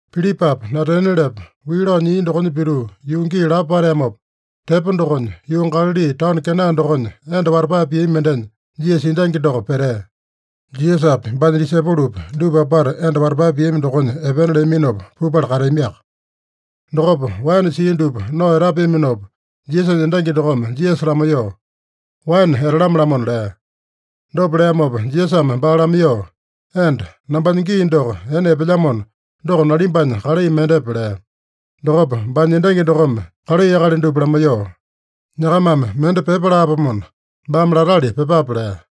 Pilipapa Natanielepa wii lao nyia dokonya pituu yuu gii lapo pateamopa tepo dokonya, yuu Galali taono Kena dokonya enda watapae piami mendenya Jisasa endangi doko petea. Jisasapi, baanya disaipolopi, dupa apata enda watapae piami dokonya epena leaminopa pupala kateamiaka. Dokopa waene sia dupa nao etapeaminopa, Jisasanya endangi dokome Jisasa lamaiyoo, “Waene etalame-lamona” lea. Dopa leamopa Jisasame baa lamaiyoo, “Enda, nambanya gii doko ene epelyamona, doko nalimbanya kalai mendepe?” lea. Dokopa baanya endangi dokome kalai akali dupa lamaiyoo, “Nyakamame mende pyepa laapomona, baame latali pyepape” lea.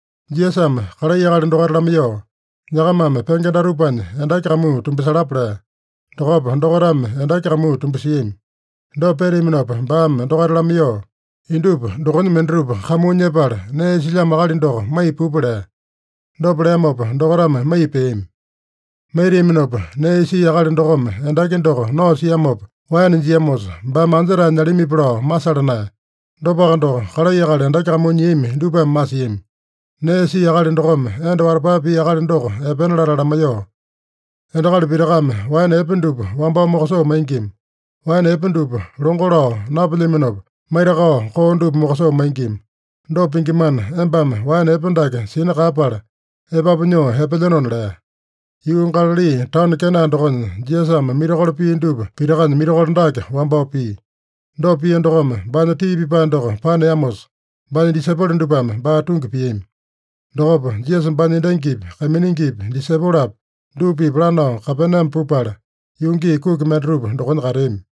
Jisasame kalai akali dokaita lamaiyoo, “Nyakamame penge datupanya endaki kamuu tumbasalapa” lea. Dokopa dokaitame endaki kamuu tumbasiami. Dopa peteaminopa baame dokaita lamaiyoo, “Indupa dokonya mendatupa kamuu nyepala nee isilyamo akali doko maiya pupa” lea. Dopa leamopa dokaitame maiya peami. Maitiaminopa, nee isia akali dokome endaki doko nao siamopa waene jiamosa, baame anja-tae nyalamipi lao masala naeya. Dopaka doko, kalai akali endaki kamuu nyiami dupame masiami. Nee isia akali dokome enda watapae pia akali doko epena latala lamaiyoo, “Endakali pitakame waene epe dupa wambao mokosoo maingima. Waene epe dupa longo lao napelyaminopa, maitakao koo dupa mokosoo maingima. Dopa pingimana, embame waene epe dake sina kaeyapala, epapu nyoo epelyenona” lea. Yuu Galali taono Kena dokonya, Jisasame mirakolo pia dupa pitakanya mirakolo dake wambao pia. Dopa pia dokome, baanya tii pipae doko paneamosa, baanya disaipolo dupame baa tungi piami. Dokopa Jisasa baanya endangipi, kaiminingipi, disaipolopi, dupa-pipa lanao Kapename pupala, yuu gii kuki mendatupa dokonya kateami.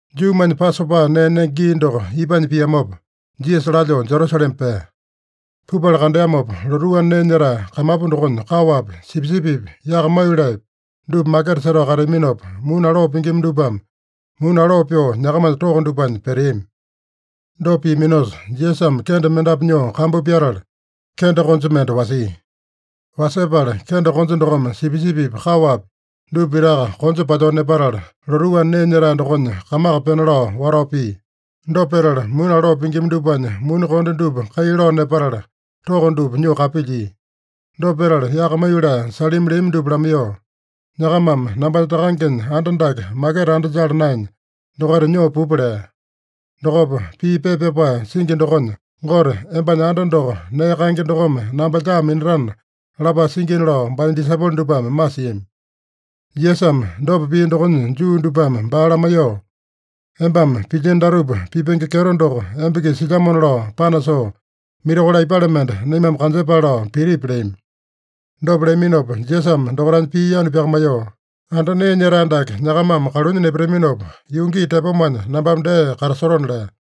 Juumanya Pasopa nee nenge gii doko ipanya piamopa, Jisasa lalyoo Jerusalema pea. Pupala kandeamopa, lotuu anda nee nyetae kamapu dokonya kaowapi, sipisipipi, yaka maiyoleepi dupa maketa setao kateaminopa, muni aloo pingima dupame muni aloo pyoo nyakamanya toko dupanya peteami. Dopa piaminosa, Jisasame kende mendapu nyoo kambu pyatala, kende konja mende wasia. Wasepala kende konja dokome sipisipipi, kaowapi dupa pitaka konja palyoo nepatala, lotuu anda nee nyetae dokonya kamaka pena lao watao pia. Dopa petala, muni aloo pingima dupanya muni konde dupa kai lao nepatala, toko dupa nyoo kapilyia. Dopa petala yaka maiyolee salimi leami dupa lamaiyoo, “Nyakamame nambanya Takangenya anda dake maketa anda jala naenya, dokaita nyoo pupa” lea. Dokopa, pii pepa pyapae singi dokonya, “Gote, embanya anda doko nee kaenge dokome namba lyaa minatana” lapae singina lao baanya disaipolo dupame masiami. Jisasame dopa pia dokonya Juu dupame baa lamaiyoo, “Embame pilyino datupa pipenge kyeto doko emba-kisa silyamona lao panasoo, mirakolo aipale mende naimame kanjepale lao pitipi?” leami. Dopa leaminopa Jisasame dokaitanya pii yanu pyakamaiyoo, “Anda nee nyetae dake nyakamame kalunya nepataminopa, yuu gii tepomanya nambame dee katasotona” lea.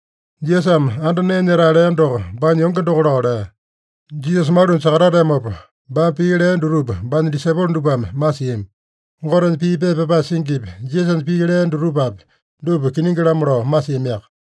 Jisasame anda nee nyetae lea doko, baanya yonge doko lao lea. Jisasa malunya sakatateamopa, baame pii lea dutupa baanya disaipolo dupame masiami. Gotenya pii pepa pyapae singipi, Jisasanya pii lea dutupapi, dupa kiningi-lamo lao masiamiaka.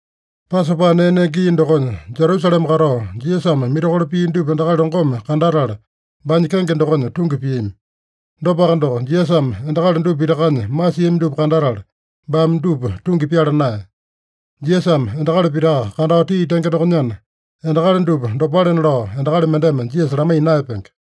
Pasopa nee nenge gii dokonya Jerusalema katao Jisasame mirakolo pia dupa endakali longome kandatala baanya kenge dokonya tungi piami. Dopaka doko, Jisasame endakali dupa pitakanya masiami dupa kandatala, baame dupa tungi pyala naeya. Jisasame endakali pitaka kandao tii tenge dokonyana, endakali dupa dopalena lao endakali mendeme Jisasa lamaiya naeyapenge.